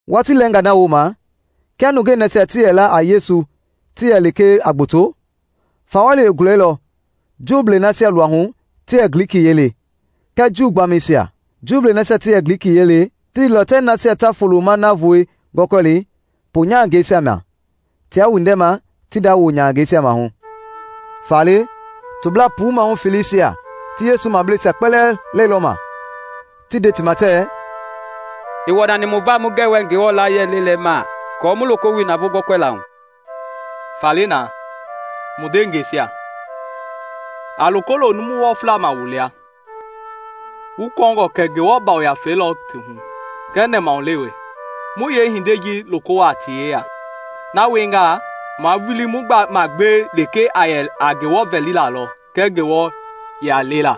Watii lɛɛngaa na wooma, kia nungei nasia ti yɛ la a Yesu ti yɛ lekee a gboto, fawɔli i gulɛilɔ Juu nasia luahu ti yɛ Glikiyiɛi le kɛɛ Juu gbaamɛisia. Juu nasia ti yɛ Glikiyiɛi le ti ndeilɔ tɛɛ nasia ta folo-ma navoei gɔlɛkɔlɛ poonyahangɛisia ma tiaa windɛma ti nda woonyahangɛisia maahu. Faale toblaa puu maahu feleisia ti Yesu mableisia kpɛlɛɛ lɛilɔma ti nde ti ma tɛɛ, “Ii wɔnani mu va mu gɛwɛ Ngewɔ layie lelei ma aako mu loko wili navoo gɔlɛkɔlɛla hu. Faale na, mu ndeengɛisia, a loko lo numu wɔfla ma wu lia, wu kɔɔngɔ kɛ Ngewɔ Yafei lɔ ti hu kɛɛ nɛmahulewe, mu yeehindei ji loko wuaa ti yeya. Na wiengaa, mua vulii mu magbewe lekee a yɛ a Ngewɔ vɛlilaa lɔ kɛɛ Ngewɔ yiɛi lela.”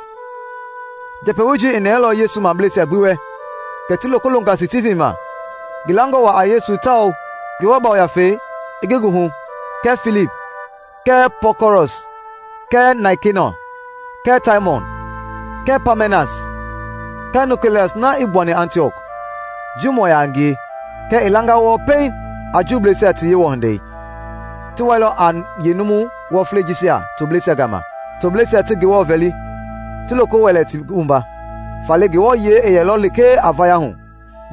Njɛpɛwoi ji i nɛɛlɔ Yesu mableisia gbi wɛ, kɛ ti loko longa Stivin ma, ngi langa waa a Yesu tawao Ngewɔ Yafei i ngi hu kɛɛ Filip kɛɛ Prɔkɔrɔs kɛɛ Naikenɔ kɛɛ Taimɔn kɛɛ Paamɛnas kɛɛ Nikɔleɔs na i gbuani Antiɔk, Juumɔ yaa a ngie kɛɛ i langa wɔɔ pɛiŋ a Juuisia ti Yewɔ hindei. Ti wailɔ a yeenumu wɔflei jisia tobleisia gama, tobleisia ti Ngewɔ vɛli, ti loko wɛlɛ ti wumba. Faale Ngewɔ yiɛi i yɛlɔ lekee a vaya hu.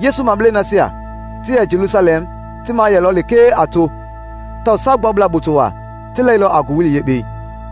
Yesu mableisia nasia ti yɛ Jelusalɛm ti maa yɛlɔ lekee a to tawao Saagbuablaa gboto waa ti lɛilɔ a ngowili Yekpei.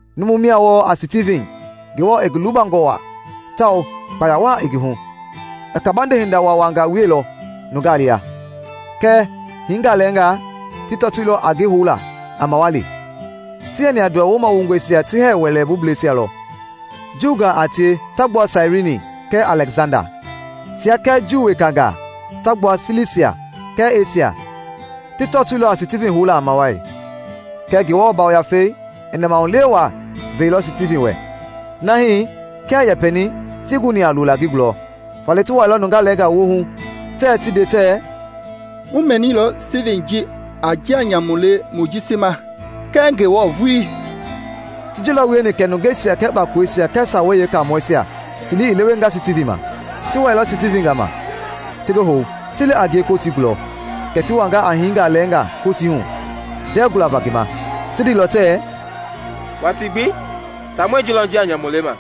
Numu mia wɔɔ a Stivin Ngewɔ i ngi lubangɔ waa tawao kpaya waa i ngi hu. I kabande hinda waawangaa wieilɔ nungaa lia. Kɛɛ hiingaa lɛɛngaa ti tɔtoilɔ a ngi houla a mawali; ti yɛni a Nduwɔ Wumawongɔisia ti hɛɛ wɛlei bublɛisia lɔ, Juungaa a tie ta gbua Sairini kɛɛ Alɛksanda. Tia kɛɛ Juu wekangaa ta gbua Silisia kɛɛ Esia ti tɔtoilɔ a Stivin houla a mawali. Kɛɛ Ngewɔ Yafei i nɛmahulewe waa veilɔ Stivin wɛ na hii kia i yɛpɛni tii guni a lola ngi gulɔ. Faale ti wuailɔ nungaa lɛɛngaa woohu tɛɛ ti nde tɛɛ, “Mu mɛnilɔ Stivin ji a njia nyamu le Mojisi ma kɛɛ Ngewɔ vulii!” Ti ji lɔ wieni kɛ nungeisia kɛɛ kpakoleisia kɛɛ Sawei Yeekaamɔisia ti lii i lewenga Stivin ma. Ti wɛilɔ Stivin gama, ti ngi hou, ti li a ngie Kotii gulɔ. Kɛ ti wanga a hiingaa lɛɛngaa Kotii hu ndɛɛ gualava ngi ma. Ti ndeilɔ tɛɛ, “Watii gbi taamɔi ji lɔ njia nyamu lema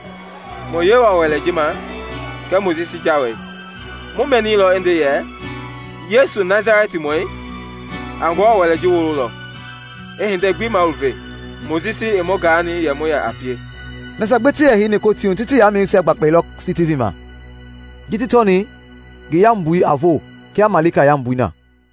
mu Yewɔ Wɛlei ji ma kɛɛ Mojisi Jawei. Mu mɛnilɔ i nde yɛ Yesu Nasalɛtimɔi ji a Ngewɔ Wɛlei ji wololɔ, i hindei gbi maluve Mojisi i mu gaani yɛ mu yɛ a pie!” Nasia gbi ti yɛ heini Kotii hu ti ti yamɛisia gbakpailɔ Stivin ma ji ti tɔni ngi yambui a voo kia malika yambu i na.